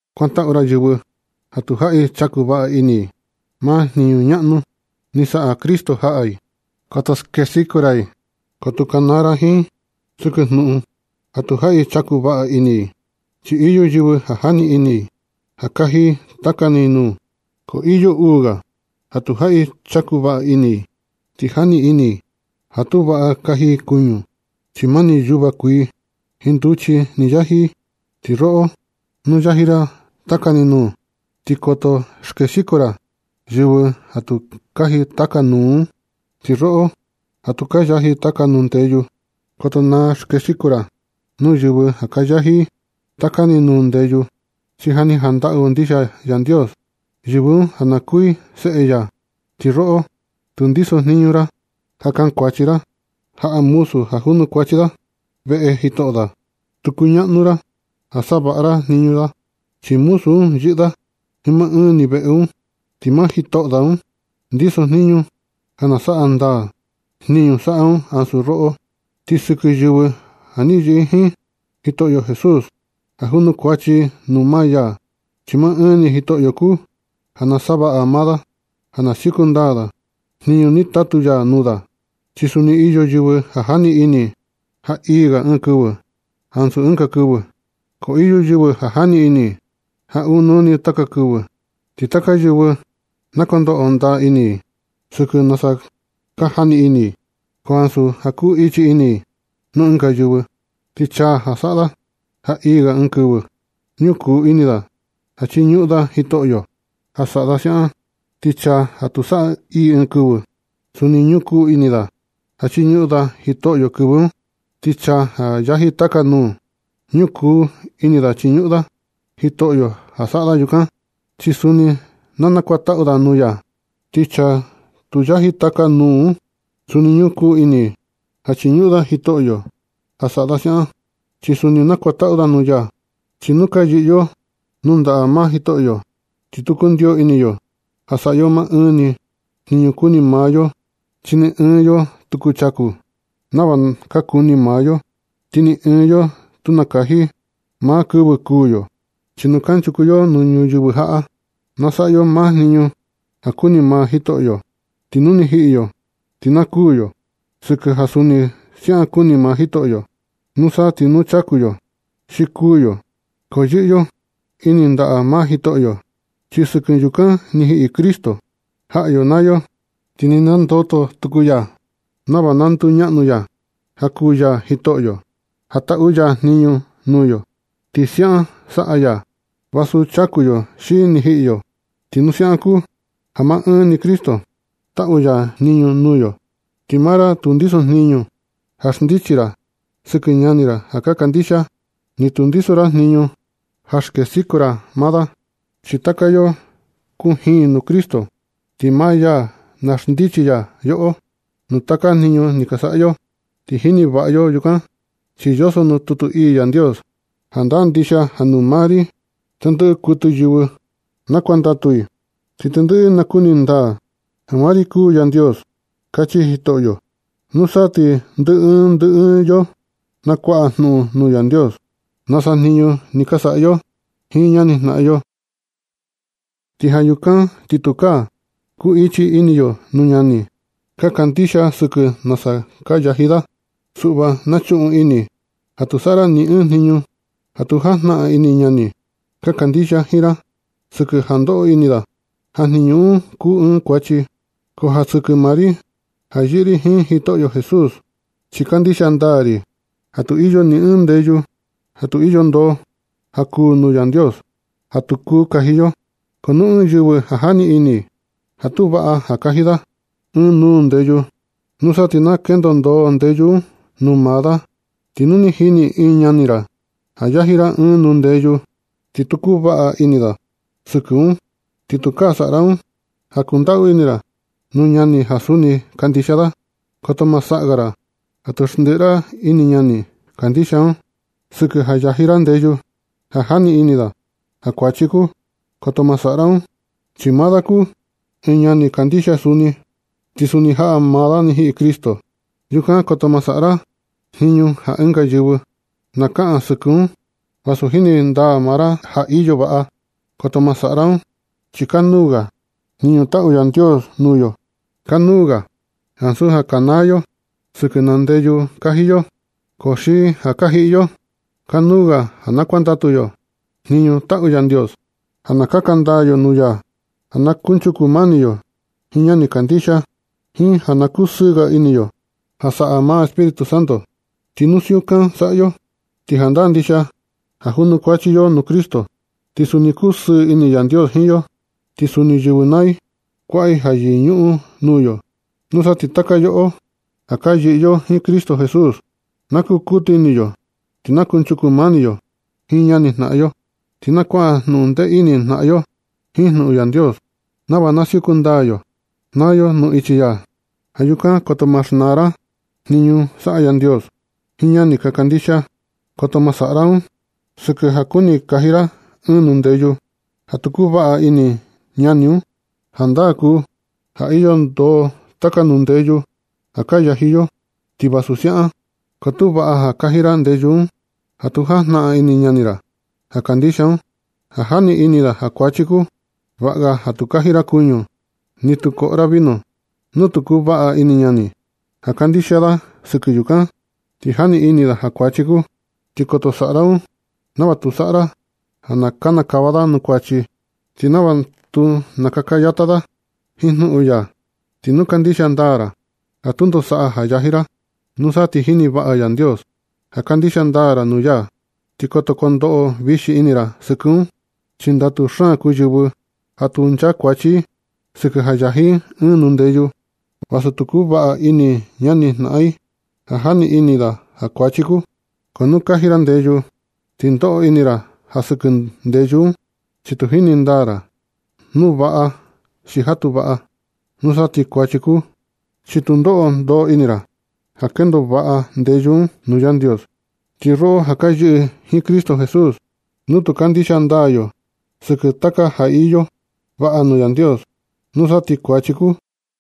Kuantaꞌu ra yɨvɨ ja tu jaꞌi chaku vaꞌa ini i maa jniñu ñaꞌnu ni saꞌa Cristo jaꞌa i. Koto skexiko ra i, ko tu kanaa ra jiin i sɨkɨ jnuꞌun ja tu jaꞌi chaku vaꞌa ini i. Chi iyo yɨvɨ ja jani ini ja kaji taka ni nuu, ko iyo uu ga ja tu jaꞌi chaku vaꞌa ini ti jani ini i ja tu vaꞌa kaji i kuñu, chi mani yuva kuii jiin nduchi ni yaji i. Ti roꞌo, nu yaji ra taka ni nuu, ti koto skexiko ra yɨvɨ ja tu yaji taka nuu un. Ti roꞌo ja tu ka yaji taka nuu ndeyu, koto na skexiko ra nuu yɨvɨ ja ka yaji i taka ni nuu ndeyu, chi ja ni jantaꞌu ndixia Yandios yɨvɨ un ja kuu i seꞌe ya. Ti roꞌo, tu ndisojniñu ra ja kankuachi ra jaꞌa muzu ja junukuachi da veꞌe jitoꞌo da. Tu kuñaꞌnu ra ja savaꞌa ra jniñu da un. Chi muzu un yɨꞌɨ da jiin maa ɨɨn ni veꞌe un, ti maa jitoꞌo da un ndiso jniñu ja na saꞌa ndaa jniñu saꞌa da ansu roꞌo. Ti sɨkɨ yɨvɨ ja yɨꞌɨ i jiin Jitoꞌyo Jesús, ja junukuachi i nuu maa ya, chi maa ɨɨn ni Jitoꞌyo kuu ja na savaꞌa maa da, ja na siuku ndaa da jiin jniñu ni tatu ya nuu da. Chi suni iyo yɨvɨ ja jani ini i ja ii ga ɨɨn kɨvɨ ansu ɨnga kɨvɨ. Ti iyo yɨvɨ ja jani ini i ja ɨɨn nuu ni taka kɨvɨ. Ti taka yɨvɨ na kondoꞌo ndaa ini i sɨkɨ nasa ka jani ini i, ko ansu ja ku ichi ini i nuu ɨnga yɨvɨ. Ti chaa ja saꞌa da ja ii ga ɨɨn kɨvɨ, ñukuu ini da ja chiñuꞌun da Jitoꞌyo ja saꞌa da siaꞌan, ti chaa ja tu saꞌa ja ii ɨɨn kɨvɨ, suni ñukuu ini da ja chiñuꞌun da Jitoꞌyo kɨvɨ un. Ti chaa ja yaji taka nuu, ñukuu ini da chiñuꞌun da Jitoꞌyo ja saꞌa da yukan, chi suni na kuantaꞌu da nuu ya. Ti chaa tu yaji taka nuu un, suni ñukuu ini ja chiñuꞌun da Jitoꞌyo ja saꞌa da siaꞌan. Chi suni nakuantaꞌu da nuu ya. Chi nu ka yɨꞌɨ yo nuu ndaꞌa maa Jitoꞌyo, ti tu kundiyo ini yo ja saꞌa yo maa ɨɨn ni jniñu kuni maa yo, chi ni ɨɨn yo tu kuchaku nava ka kuni maa yo, ti ni ɨɨn yo tu nakaji maa kɨvɨ kuū yo. Chi nu kanchuku yo nuu ñuyɨvɨ jaꞌa, na saꞌa yo maa jniñu ja kuni maa Jitoꞌyo. Ti nu ni jiꞌi yo, ti na kuū yo sɨkɨ ja siaꞌan kuni maa Jitoꞌyo. Nusa ti nu kuchaku yo xi kuū yo, ko yɨꞌɨ yo ini ndaꞌa maa Jitoꞌyo. Chi sɨkɨ yukan ni jiꞌi Cristo jaꞌa yo naa yo, ti ni nandoto tuku ya nava na nduñaꞌnu ya ja kuu ya Jitoꞌyo ja taꞌu ya jniñu nuu yo, ti siaꞌan saꞌa ya vasu chaku yo xi ni jiꞌi yo. Ti nu siaꞌan kuu, ja maa ɨɨn ni Cristo taꞌu ya jniñu nuu yo, ti maa ra tu ndisojniñu ja xndichi ra sɨkɨ ñani ra ja kandixia i, ni tu ndiso ra jniñu ja skexiko ra maa da. Chi taka yoꞌo kujin nuu Cristo, ti maa ya na xndichi ya yoꞌo nuu taka jniñu ni ka saꞌa yo. Ti jini vaꞌa yo yukan, chi yoso nuu tutu ii Yandios: Jandaa ndixia ja nuu maa ri tendɨꞌɨ kuɨtɨ yɨvɨ na kuandatu i. Ti tendɨꞌɨ i na kuni ndaa ja maa ri kuu Yandios. Kachi Jitoꞌyo. Nusa ti ndɨ ɨɨn ndɨ ɨɨn yo nakuaꞌa jnuꞌun nuu Yandios nasa jniñu ni ka saꞌa yo jiin ñanijnaꞌan yo. Ti ja yukan ti tukaa ku ichi ini yo nuu ñani ka kandixia sɨkɨ nasa ka yaji da. Suꞌva na chuꞌun ini ja tu saꞌa ra ni ɨɨn jniñu ja tu jajnaꞌan ini ñani ka kandixia jiin ra, sɨkɨ ja ndoꞌo ini da ja jniñu un kuu ɨɨn kuachi. Ko ja sɨkɨ maa ri ja yɨꞌɨ ri jiin Jitoꞌyo Jesús, chi kandixia ndaa ri ja tu iyo ni ɨɨn ndeyu ja tu iyo ndoo ja kuu nuu Yandios, ja tu kuu kaji yo. Ko nu ɨɨn yɨvɨ jani ini ja tu vaꞌa ja kaji da ɨɨn nuu ndeyu, nusa ti tu kendo ndoo ndeyu un nuu maa da. Ti nu ni jini ɨɨn ñani ra ja yaji ra ɨɨn nuu ndeyu ti tu kuvaꞌa ini da sɨkɨ un, ti tukaa saꞌa ra un ja kundaꞌu ini ra nuu ñani ja suni kandixia da. Koto ma saꞌa ga ra ja tu xndiꞌi ra ini ñani kandixia un, sɨkɨ ja yaji ra ndeyu ja jani ini da ja kuachi kuu. Koto ma saꞌa ra un chi maa da kuu ɨɨn ñani kandixia suni, ti suni jaꞌa maa da ni jiꞌi Cristo. Yukan koto ma saꞌa ra jniñu ja ɨnga yɨvɨ na kaꞌan sɨkɨ un vasu jini ndaa maa ra ja iyo vaꞌa. Koto ma saꞌa ra un chi kanuu ga jniñu taꞌu Yandios nuu yo. Kanuu ga un ansu ja kanaa yo sɨkɨ naa ndeyu ka yaji yo xi ja ka jiꞌi yo. Kanuu ga ja kuandatu yo jniñu taꞌu Yandios, ja na kaka ndaa yo nuu ya, ja na kunchuku mani yo jiin ñani ja kandixia, jiin ja na kusɨɨ ga ini yo ja saꞌa maa Espíritu Santo. Ti nu siukan saꞌa yo, ti jandaa ndixia ja junukuachi yo nuu Cristo. Ti suni kusɨɨ ini Yandios jiin yo. Ti suni yɨvɨ naa i kuaꞌa i ja yɨñuꞌun nuu yo. Nusa ti taka yoꞌo ja ka yɨꞌɨ jiin Cristo Jesús, na kukutu ini yo ti na kunchuku mani yo jiin ñanijnaꞌan yo, ti na kuaꞌa jnundee ini jnaꞌan yo jiin jnuꞌun Yandios, nava na siuku ndaa yo naa yo nuu ichi ya. Ja yukan, koto ma xnaa ra jniñu ja saꞌa Yandios jiin ñani ka kandixia. Koto ma saꞌa ra un sɨkɨ ja kuni kaji ra ɨɨn nuu ndeyu ja tu kuvaꞌa ini ñani un. Jandaa kuu ja iyo ndoo taka nuu ndeyu ja ka yaji yo. Ti vasu siaꞌan, ko tu vaꞌa ja kaji ra ndeyu un ja tu jajnaꞌan ini ñani ra ja kandixia un, ja jani ini da ja kuachi kuu. Vaꞌa ga ja tu kaji ra kuñu, ni tu koꞌo ra vino nu tu kuvaꞌa ini ñani ja kandixia da sɨkɨ yukan, chi jani ini da ja kuachi kuu. Ti koto saꞌa ra un nava tu saꞌa ra ja na kinikava da nuu kuachi, ti nava tu na kakayata da jiin jnuꞌun ya. Ti nu kandixia ndaa ra ja tundo saꞌa ja yaji ra, nusa ti jini vaꞌa Yandios ja kandixia ndaa ra nuu ya, ti koto kondoꞌo vixi ini ra sɨkɨ un. Chi ndatu xaan kuu yɨvɨ ja tu nchakuachi i sɨkɨ ja yaji i ɨɨn nuu ndeyu, vasu tu kuvaꞌa ini ñanijnaꞌan i ja jani ini da ja kuachi kuu. Ko nu kaji ra ndeyu ti ndoꞌo ini ra sɨkɨ ndeyu un, chi tu jini ndaa ra nu ja vaꞌa xi ja tu vaꞌa. Nusa ti kuachi kuu, chi tu ndoꞌo ndoo ini ra ja kendo vaꞌa ndeyu un nuu Yandios. Ti yoꞌo ja ka yɨꞌɨ jiin Cristo Jesús, nu tu kandixia ndaa yo sɨkɨ taka ja iyo vaꞌa nuu Yandios, nusa ti kuachi kuu.